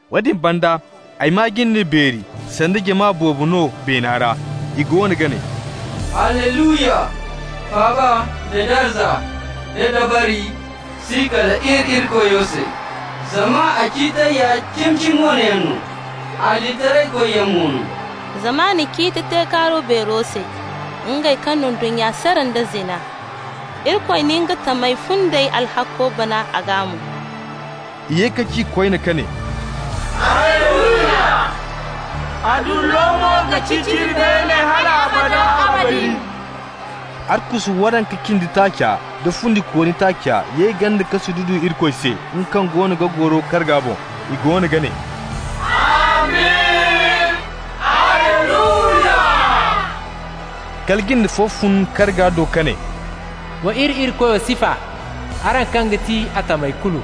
Woodin banda ay maa jinde beeri, sanda jama boobo no beena ra. I goono ga ne: «Alleluya! Faaba nda darza nda dabari si kal iri Irikoyo se! Zama a ciitey ya cimi-cimi wane yaŋ no, adilitaraykoyyaŋ mo no. Zama a na ciiti te kaaruwa beero se, nga kaŋ na ndunnya sara nda nga zina. Irikoy na nga tamey fundey alhakko bana a gaa mo.» I ye ka ci koyne ka ne: «Alleluya! A dullo mo ga ciciri beene hal abada abadin!» Arkusu waranka cindi taaca da fundikooni taaca ye ganda ka sududu Irikoy se, nga kaŋ goono ga goro karga boŋ. I goono ga ne: «Amin! Alleluya!» Kala jinde fo fun karga do ka ne: «Wa iri Irikoyo sifa, araŋ kaŋ ga ti a tamey kulu,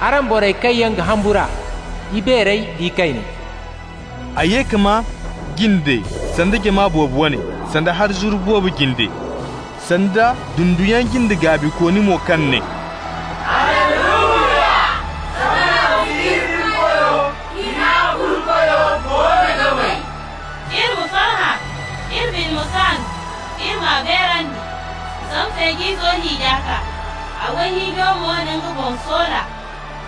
araŋ borey kaŋ yaŋ ga humbur'a, ibeerey da ikayney.» Ay ye ka maa jinde sanda jama boobo wane, sanda hari zuru boobo jinde, sanda dunduyaŋ jinde gaabikooni mo kaŋ ne: «Alleluya! Zama Rabbi iri Irikoyo, Hina-Kulu-Koyo goono ga may! Iri ma farhã, iri bine ma kaan, iri m'a beerandi! Zama Feej'izo hiija kaa, a wayhiijo mo na nga boŋ soola.»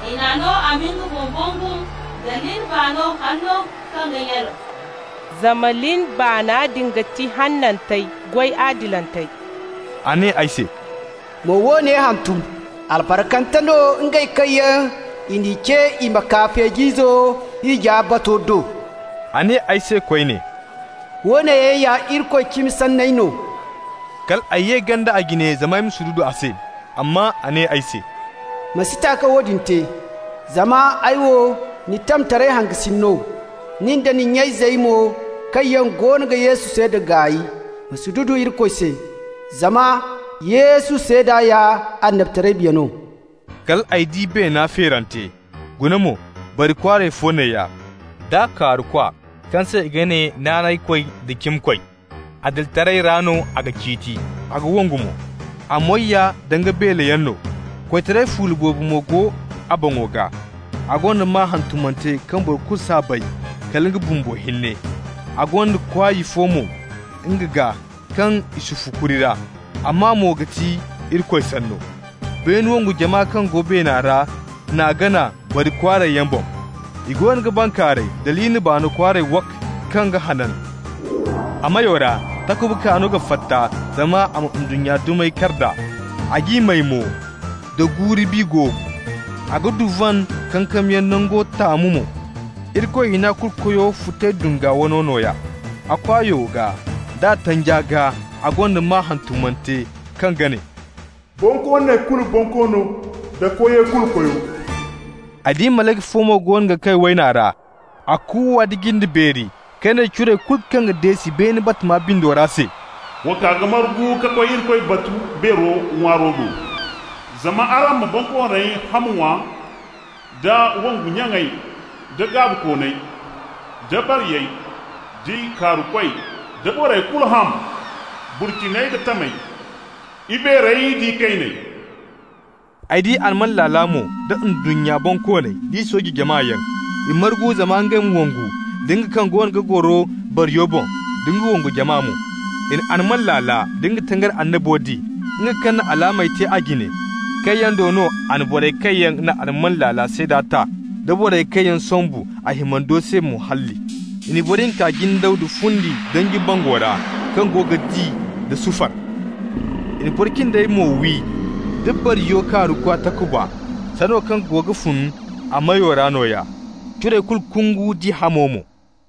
I n'a no a ma nga boŋ bangum da lin baano hanno kaŋ ga nyalaw, (zama lin baana din ga ti hanantey goy adilantey). A ne ay se: «Ma woone hantum: Albarkante no ngey kaŋ yaŋ i n'i ce i ma kaa Feej'izo hiija bato do.» A ne ay se koyne: «Woone yaŋ ya Irikoy cimi sanney no.» Kal ay ye ganda a jine zama ya sududu a se. Amma a ne ay se: «Ma si ta ka woodin te! Zama ay wo ni tamtaray hangasin no, nin da ni nya-izey mo kaŋ yaŋ goono ga Yesu seeda gaay. Ma sududu Irikoy se. Zama Yesu seeda ya annabitaray biya no.» Kal ay di beena feerante. Guna mo, bari kwaaray fo neeya, d'a kaarukwa kaŋ se i ga ne Naanaykoy da Cimikoy. Adilitaray ra no a ga ciiti, a ga wongu mo. A moy ya danga beeleyaŋ no, koytaray fuula boobo mo go a boŋo gaa. A gonda maa hantumante kaŋ boro kulu s'a bay kala nga bumbo hinne. A gonda kwaay fo mo nga gaa kaŋ i sufu kuri ra, a maa mo ga ti Irikoy Sanno. Beene wongu jama kaŋ go beena ra n'a gana bari kwaarayyaŋ boŋ, i goono ga bankaaray da lin baano kwaaray wak! kaŋ ga hanan. A meyo ra takuba kaano ga fatta zama a ma ndunnya dumey kar nd'a, a g'i may mo da guuru-bi goobu. A ga duvan kankamyaŋ nango taamu mo, Irikoy Hina-Kulu-Koyo futay dunga wano nooya. A kwaayo gaa d'a tanja gaa a gonda maa hantumante, kaŋ ga ne: BONKOONEY KULU BONKOONO DA KOYEY KULU KOYO Ay di malayka fo mo goono ga kay wayna ra. A kuuwa nda jinde beeri ka ne curey kulu kaŋ ga deesi beene batama bindo ra se: «Wa kaa ka margu ka koy Irikoy batu beero ŋwaaro do! Zama araŋ ma bonkooney ham ŋwa, da wongu nyaŋey, da gaabikooney, da bariyey, d'i kaarukoy, da borey kulu ham, burciney da tamey, ibeerey da ikayney.» Ay di alman laala mo da ndunnya bonkooney d'i sooje jamayaŋ. I margu zama ngey ma wongu da nga kaŋ goono ga goro bariyo boŋ nda nga wongu jama mo. I na alman laala da nga tangari annabo di, nga kaŋ na alaamey te a jine, kaŋ yaŋ do no a na borey kaŋ yaŋ na alman laala seeda ta da borey kaŋ yaŋ sombu a himando se mo halli. I n'i boro hinka jindaw da fundi danji bango ra, kaŋ go ga di da sufar. I na boro cindey mo wi da bariyo kaarukwa takuba, sanda wo kaŋ goono ga fun a meyo ra nooya. Curey kulu kungu nd'i hamo mo.